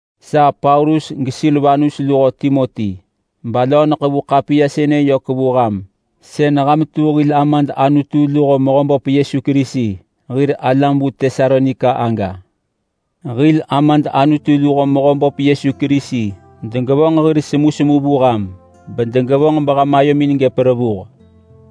Sa Paulus geSilvanus luho Timoti, balöö neḳevu ḳapiya sënë vu ham sën ham tu hil Amad Anutu luho Mehöböp Yesu Kerisi hir alam vu Tesalonika lo. Hil Amad Anutu luho Mehöböp Yesu Kerisi degevonġ hir semusemu vu ham bedegevonġ beham ayomin gëp revuh.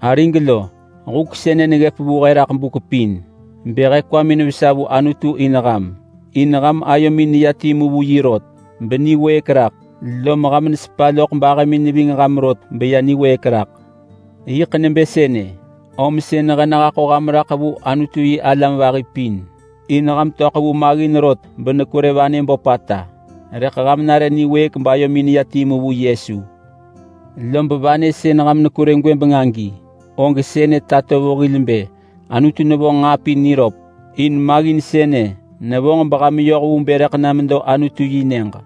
Arig lo, huk sënë neggëp vu he raḳ buk pin bë he kwamin vesa vu Anutu in ham. In ham ayomin neya timu vu yi rot beniwëëk raḳ, lom ham nesepa loḳ bahëmin neving ham rot beya meniwëëk raḳ. Yiḳ nebë sënë, om sën he nehaḳo ham raḳ vu Anutu-yi-alam vahi pin. In ham töḳ vu maggin rot benekwerë vanë böpata, rëḳ ham nare niwëëk bayomin neya timu vu Yesu. Lob vanë sën ham nekwerë gwëbeng agi, og sënë tato vu hil bë Anutu nevonġ nġaa pin niröp, in maggin sënë nevonġ beham yoh vu bë rëḳ na medo Anutu yi nyëġ.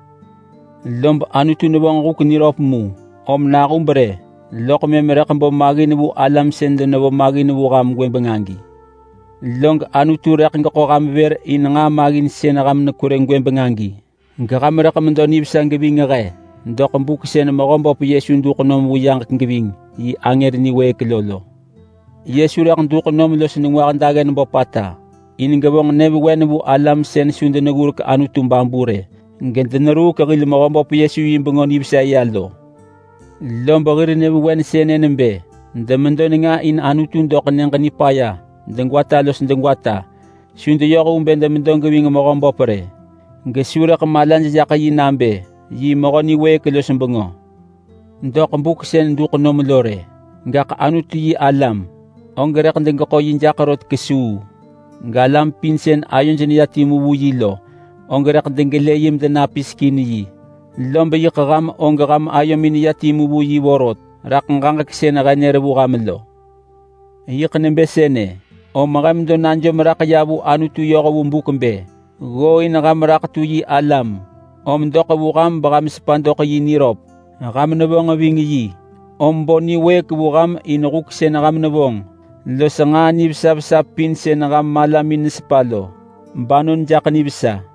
Lob Anutu nevonġ huk niröp mu, om nahub rë loḳ mëm rëḳ bo maggin vu alam sën denevo maggin vu ham gwëbeng agi. Log Anutu rëḳ geḳo ham vër in nġaa maggin sën ham nekwerë gwëbeng agi, geham rëḳ medo nivesa geving he doḳ buk sën Mehöböp Yesu duḳ nom vu yaġek geving yi angër niwëëk lo lo. Yesu rëḳ duḳ nom los nengwah daggen böpata in gevonġ nyëvewen vu alam sën su deneggurek Anutu babu rë, gedeneruuk hil Mehöböp Yesu yi Bengö Nivesa ya lo. Lob hir nyëvewen sënë nebë: Demedo nenga in Anutu doḳ Nyëġ Nipaya degwata los degwata. Su deyoh vu bë demedo geving Mehöböp rë, gesu rëḳ malaj jaḳ yi nabë yi Mehö niwëëk los bengö doḳ buk sën duḳ nom lo rë. Gaḳ Anutu-yi-alam, og rëḳ degeḳo yi jaḳ rot kesuu, galam pin sën ayoj neya timu vu yi lo og rëḳ degelë yi medenapisek in. Lob yiḳ ham og ham ayomin neya timu vu yi vorot raḳ ġaġek sën he nër vu ham lo. Yiḳ nebë sënë, om he medo najom raḳ ya vu Anutu yoh vu buk bë: Ggooin ham raḳ tu yi alam, om doḳ vu ham beham sepa doḳ yi niröp. Ham nevonġ ving yi om bo niwëëk vu ham in huk sën ham nevonġ los nġaa nivesa vesa pin sën ham malamin nesepa lo, banon jaḳ nivesa.